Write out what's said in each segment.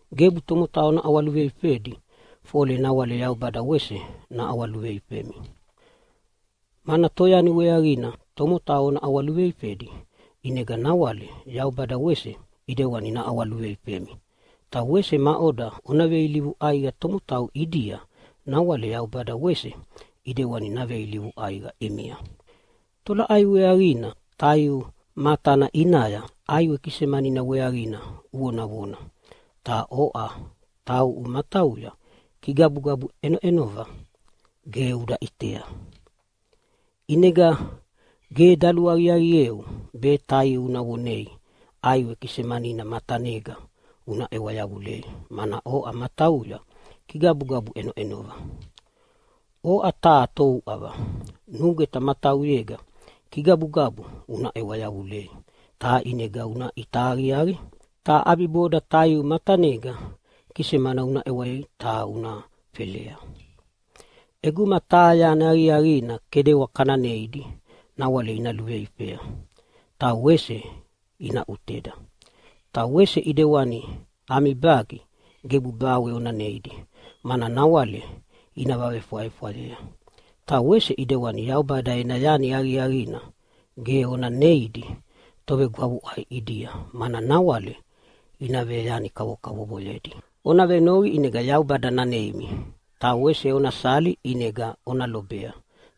“Gebu tomotau ona ʼawaluveifedi fole nawale Yaubada wese naʼawaluveifemi, mana toyani weaqina tomotau ona ʼawaluveifedi ʼinega nawale Yaubada wese ʼidewani naʼawaluveifemi. Ta wese maʼoda ona veilivu ʼaiqa tomotau ʼidia nawale Yaubada wese ʼidewana naveilivu ʼaiqa ʼimia. Ta tolaʼai weaqina taiu matana ʼinaya ʼaiwe kisemanina weaqina uvonavona ta oʼa tauʼu matauya kigabugabu ʼenoʼenova ta ge uda ʼitea? ʼInega ge daluaqiaqieu be taiu una vonei ʼaiwe kisemanina matanega una ʼewa yavulea, mana oʼa matauya kigabugabu ʼenoʼenova. Oʼa taha touʼava, nugweta matauyega kigabugabuna una ʼewa yavulei ta ʼinega una ʼita aqiaqi, ta ʼabiboda taiu matanega kisemana una ʼewei ta una felea. ʼEguma taha yani aqiaqina kedewa kana neidi, nawale ina luveifea ta wese ina ʼuteda. Ta wese ʼidewani ami bagi gebu bawe ona neidi mana nawale ina vavefwayefwayea. Ta wese ʼidewani Yaubada ena yani aqiaqina ge ona neidi tovegwavuʼai ʼidia mana nawale ina veyani kavokavovoyedi. “Ona venoqi ʼinega Yaubada naneimi, ta wese ona sali ʼinega ona lobea,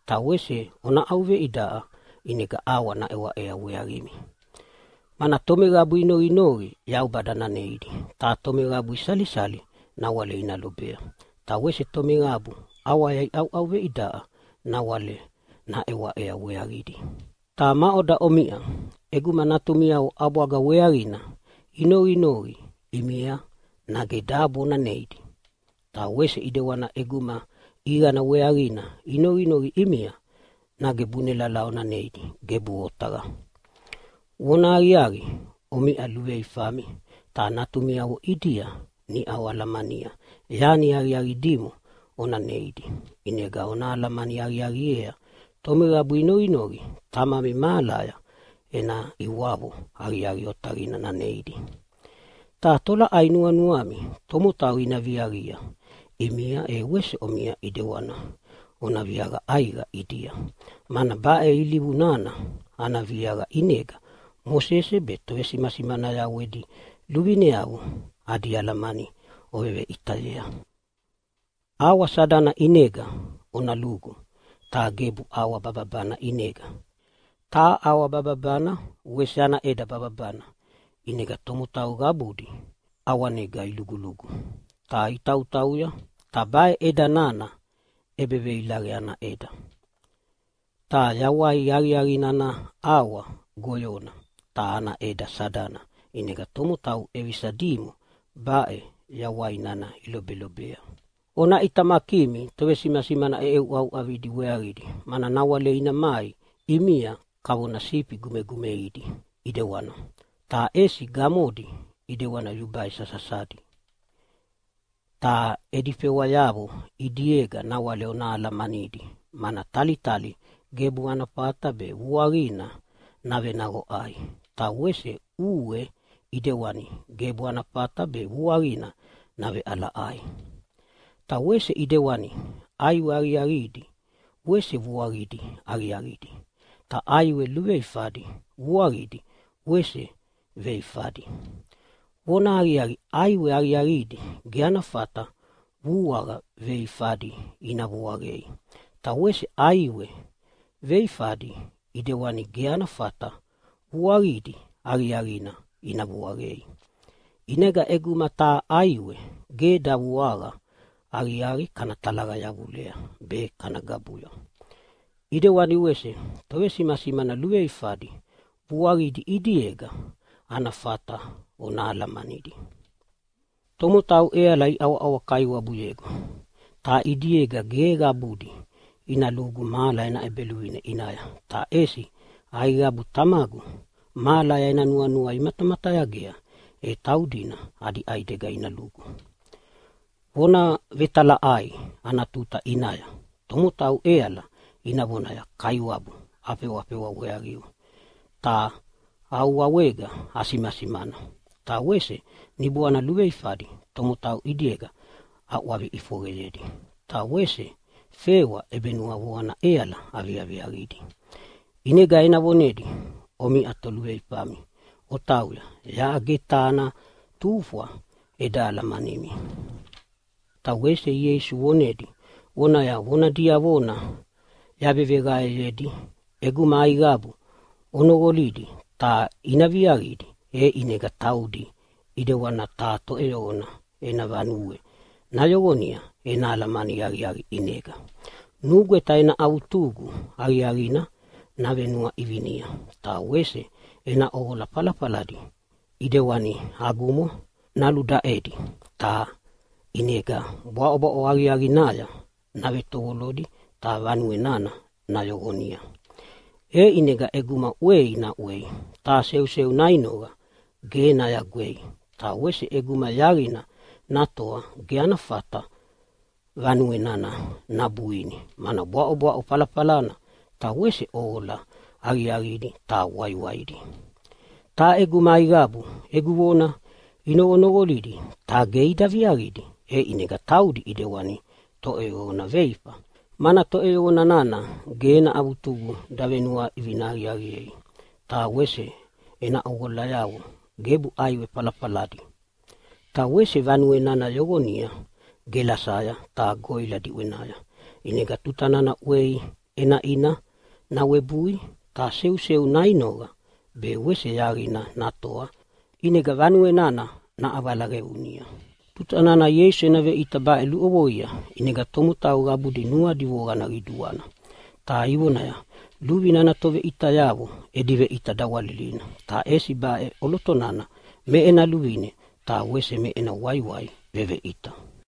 ta wese ona ʼauveidaʼa ʼinega ʼawa naʼewaʼea weaqimi. Mana tomeqabu inoqinoqi Yaubada naneidi, ta tomeqabu isalisali nawale ina lobea, ta wese tomeqabu ʼawaya iʼauʼauveidaʼa nawale naʼewaʼea weaqidi. Ta maʼoda omiʼa ʼeguma natumiavo ʼabwaga weaqina inoqinoqi ʼimia nage dabo ona neidi? Ta wese ʼidewani ʼeguma ʼiqana weaqina inoqinoqi ʼimia nage bunelala ona neidi? Gebuʼe otaqa! Vonahaqiaqi, omiʼa luveluveifami ta natumiavo ʼidia niʼau oalamania yani aqiaqi dimo ona neidi, ʼinega ona alamani aqiaqiea tomeqabu inoqinoqi Tamami mahalaya ena ʼiwavo aqiaqi otaqina naneidi. Ta tolaʼai nuanuami tomotau ina viaqia ʼimia, e wese omiʼa ʼidewana ona viaqa ʼaiqa ʼidia. Mana baʼe ilivu nana ana viaqa ʼinega Mosese be tovesimasimanayavo edi luvineavo adi alamani oveveʼitayea. “ʼAwa sadana ʼinega ona lugu ta gebu ʼawa bababana ʼinega. Ta ʼawa bababana wese ana ʼeda bababana, ʼinega tomotau qabudi ʼawanegana ilugulugu ta itautauya. Ta baʼe ʼeda nana ʼebeveilaqe ana ʼeda. Ta yawai aqiaqina ana ʼawa goyona ta ana ʼeda sadana, ʼinega tomotau ʼevisa dimo baʼe yawai nana ilobelobea. “Ona ʼitamakimi tovesimasimana ʼeʼeuʼauʼavidi weaqidi, mana nawale ina mai ʼimia kavona sifi gumegumeidi ʼidewana, ta ʼesi gamodia ʼidewana yubai sasasadi. Ta edi fewayavo ʼidiega nawale ona alamanidi, mana talitali gebu ana fata be vuaqina navenaqoʼai, ta wese ʼue ʼidewana gebu ana fata be vuaqina naveʼalaʼai. Ta wese ʼidewani ʼaiwe aqiaqidi wese vuaqidi aqiaqidi, ta ʼaiwe veifadi vuaqidi wese veifadi. Vonahaqiaqi, ʼaiwe aqiaqidi ge ana fata vuaqa veifadi ina vuaqayei, ta wese ʼaiwe veifadi ʼidewana ge ana fata vuaqidi aqiaqina ina vuaqayei. ʼInega ʼeguma taha ʼaiwe ge davuaqa aqiaqi kana talaqa yavulei be kana gabuya. ʼIdewana wese tovesimasimana luveifadi vuaqidi ʼidiega ana fata ona alamanidi. “Tomotau ʼeala iʼawaʼawa Kaiwabuyegu, ta ʼidiega ge qabudi ina lugu mahala ena ʼEbeluvine ʼinaya, ta ʼesi aiqabu Tamagu mahalaya ena nuanua imatamatayagea e taudina adi ʼaidega ina lugu. Vona Vetalaʼai ana tuta ʼinaya tomotau ʼeala ina vonaya, ‘Kaiwabu, afewa weaqiu ta au wawega asimana ta wese niboana luveifadi tomotau ʼidiega aʼwavi ʼifoqeyedi, ta wese fewa ʼebenuavoqana ʼeala aviaqidi.’ ʼInega ena vonedi, ‘Omiʼa toluveifami, otauya! Yaʼa ge taha ana tufwa eda alamanimi!’” Ta wese Ieisu vonedi vonaya, “Vona diavona yaveveqaeyedi ʼeguma aiqabu ina noqolidi ta ina viaqidi, e ʼinega taudi ʼidewana taha toʼeyoqona ena vanue nayoqonia ena alamani aqiaqi ʼinega. Nugweta ena avutugu aqiaqina navenuaʼivinia ta wese ena ʼoqola falafaladi ʼidewana agumo naludaʼedi. Ta ʼinega bwaʼobwaʼo aqiaqinaya navetovolodi ta vanue nana nayoqonia. E ʼinega ʼeguma ʼwei naʼwei ta seuseu nainoqa ge nayagwei. Ta wese ʼeguma yaqina natoa ge ana fata vanue nana nabuini, mana bwaʼobwaʼo falafalana ta wese ʼoqola aqiaqidi ta waiwaidi. Ta ʼeguma aiqabu egu vona inoqonoqolidi ta ge ida viaqidi, e ʼinega taudi ʼidewani toʼeyoqona veifa, mana toʼeyoqona nana ge ena avutugu davenuaʼivina aqiaqiei ta wese ena ʼoqolayavo gebu ʼaiwe falafaladi. Ta wese vanue nana yoqonia gelasaya ta goʼila diʼwenaya, ʼinega tuta nana ʼwei ʼenaʼina nawebui ta seuseu nainoqa be wese yaqina natoa, ʼinega vanue nana naʼavala qeunia.” Tuta nana Ieisu ena veʼita baʼe luʼovoidi ʼinega tomotau qabudi nuadi voqana qiduana, ta ivonaya, “Luvine ana toveʼitayavo edi veʼita dawalilina, ta ʼesi baʼe ʼoloto nana me ena luvine ta wese me ena waiwai veveʼita.”